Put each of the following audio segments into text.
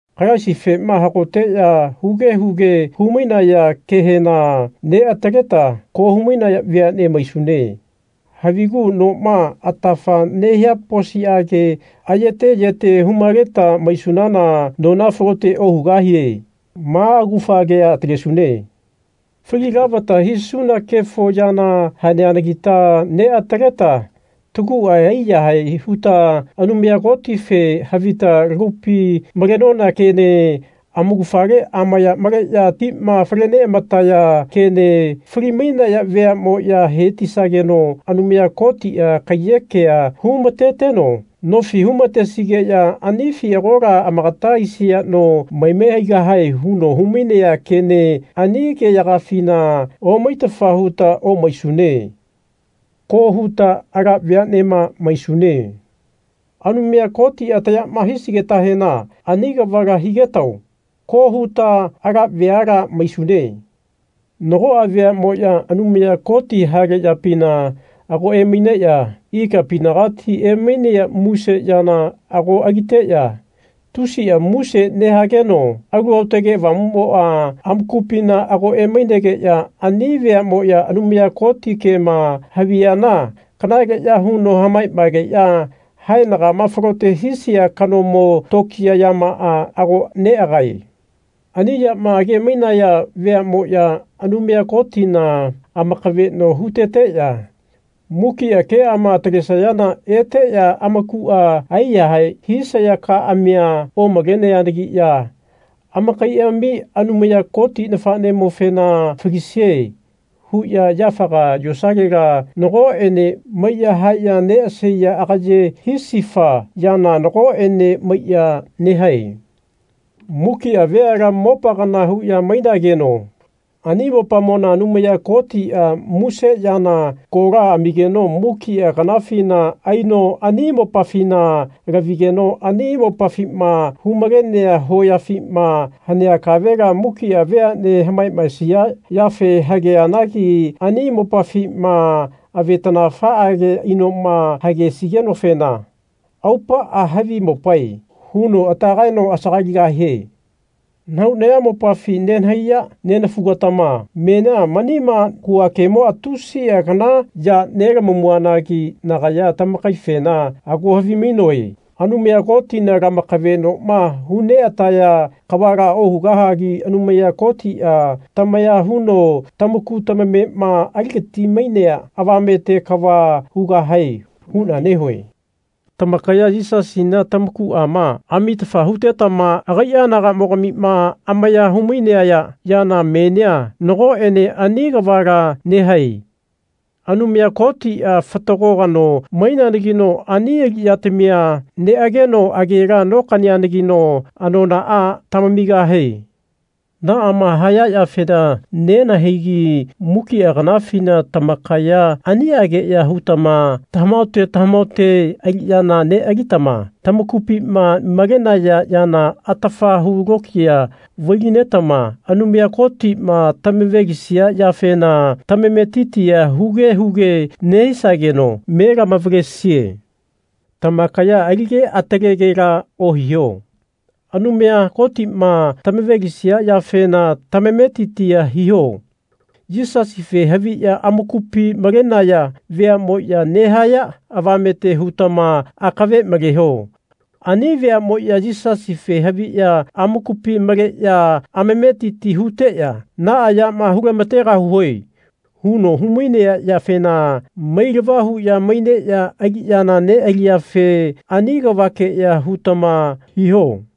Kalaisifema hagoteya huge huge hu-mainaya kehena neataleta ko hu-mainaya veane maisune. Havigu noma atafa nehia posiage ayete yete hu-maleta maisunana nona falote ohugahie. Ma augafa kea atalesune. Fali lavata hisuna kefo yana haneanagita neataleta tagua aiyahae huta Anumaya Kotife havita lagupi malenona kene amaugafale amaya maleya tima fale neamataya kene fali-mainaya veamoya hetisageno Anumaya Kotia kaiyekea humateteno nofi humatesigeya anifi agola amakata aisia no maime haigahae huno humainea kene ani keyagafina omaitafa huta omaisune. Ko huta ala veanema maisune. Anumaya Kotia tayama hisigetahena ani kavala higetao. Ko huta ala veala maisune. Nagoa veamoya Anumaya Koti hale yapina ago emaineya ikapinagati emainea muse yana ago aliteya tusia muse nehageno Alu Aotage Avamumoa amakupina ago emainegeya ani veamoya Anumaya Koti kema haviyana kanaleya huno hamamaegeya haenagama falote hisia kanamo tokiya yamaa ago neagae. Ani yama age-mainaya veamoya Anumaya Kotina amakaveno huteteya mukia keama atalesayana eteya amakua aiyahae hisaya kaamia omaleneanagiya amakaiami Anumaya Koti nafenemofena Falisie. huya yafaga yosalela nagoene maiya haeya neasaiya agaye hisifa yana nagoene maiya nehae. Mukia veala mopa kana huya mainageno ani mopamona Anumaya Kotia muse yana kola amigeno mukia kanafina aino ani mopafina lavigeno ani mopafima hu-malenea hoyafima hanea kavela mukia veane hamamaesia yafe hageanagi ani mopafima avetanafaage inoma hagesigenofena aupaa Havi mopae. huno ata kaeno asagaligahie. Nahau nayamopafi nenahaiya nenafugatama menia manima hua kemoa tusia kana ya nelamamuanagi nagaya tamakaifena ago havimainoe Anumaya Kotina lamakavenoma hu neataya kavala ohugahagi Anumaya Kotia tamaya huno tamaku tamamema aligati-mainea avamete kava hugahae huna nehue. Tamakaya Yisasina tamakuama amitafa hutetama agaia anagamogamima amaya humainaya yana menia nagoene ani kavala nehae. Anumaya Kotia fatago kano maineanagino ani aliyatamia neageno agela nokaneanagino anonaa tamamigahie. Naama haya yafena nenahaigi mukia kanafina tamakaya aniageya hutama tamahaote tamahaote aliyana nealitama tamakupima malenaya yana atafa hu lokiya vai-linetama Anumaya Kotima tamavalesia yafena tamametitia huge huge nehisageno me lamavalesie. Tamakaya alige atalegela ohiho. Anumaya Kotima tamavalesia yafena tamametitia hiho. Yisasife haviya amakupi malenaya veamoya nehaya avamete hutama akave maleho. Ani veamoya Yisasife haviya amakupi maleya amametiti huteya Naa yama hulamategahue. huno humainea yafena mailava huya maineya aliyana nealiyafe ani kavakeya hutama hiho.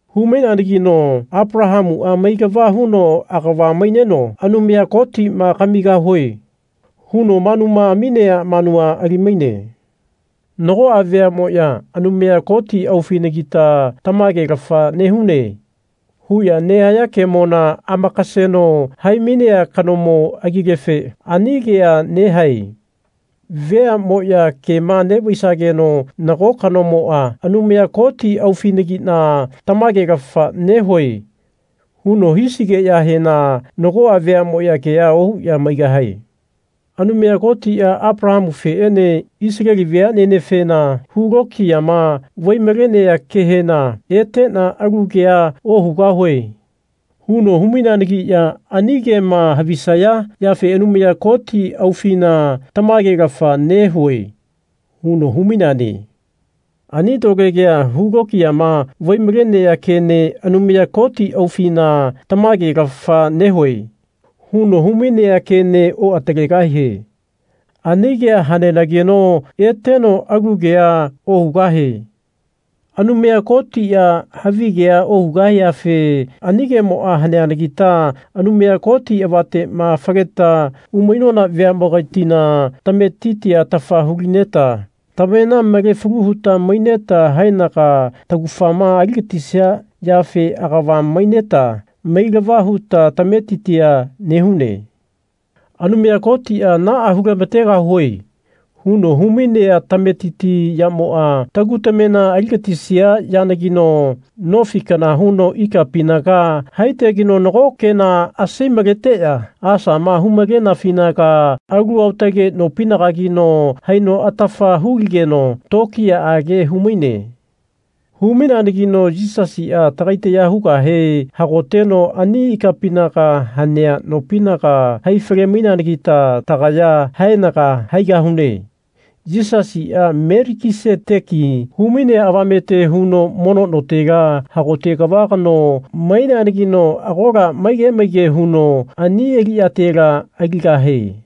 Hu-maineanagino Apalahamua mailava huno agava maineno Anumaya Kotima Kamigahue. huno manuma aminea manua alimaine. Nagoa veamoya Anumaya Koti aufinagita tamagelafa nehune. huya nehaya kemona amakaseno hai-mainea kanomo agilefe ani kea nehae. Veamoya kema nevaisageno nago kanomoa Anumaya Koti aufinagina tamagelafa nehue. huno hisigeyahena nagoa veamoya kea ohuya maigahae. Anumaya Kotia Apalahamufeene Isaleli veanenefena hu lokiyama vai-malea kehena Etena alu kea ohugahue. huno hu-maineanagiya ani kema havisaya yafe Anumaya Koti aufina tamagelafa nehue. huno humaineane. Ani lole kea, hu lokiyama vai-malenea kene Anumaya Koti aufina tamagelafa nehue. huno humainea kene oatalegahie. Ani kea hanenageno eteno alu kea ohugahie. Anumaya Kotia havigea ohugahiafe ani kemoa haneanagita Anumaya Koti avatema faleta umainona veamogatina tametitia atafa hulineta tamena male falu huta maineta haenaga taugafama aligatisia yafe agava maineta mailava huta tametitia nehune. Anumaya Kotia Naa hulamategahue. huno humainea tametiti yamoa tagu tamena aligatisia yanagino nofi kana huno ikapinaga haitegeno nago kena asai-maleteya asama hu-malenafinaga alu aotage nopinagagino haino atafa huligeno tokiyaage humaine. Hu-maineanagino Yisasia tagai taya hugahe hagoteno ani ikapinaga hanea nopinaga haifale-maineanagita tagaya haenaga haigahune. Yisasia Melikiseteki humainea avamete huno mono notela hagote kava kano maineanagino agola maige maige huno ani aliyatela aligahie.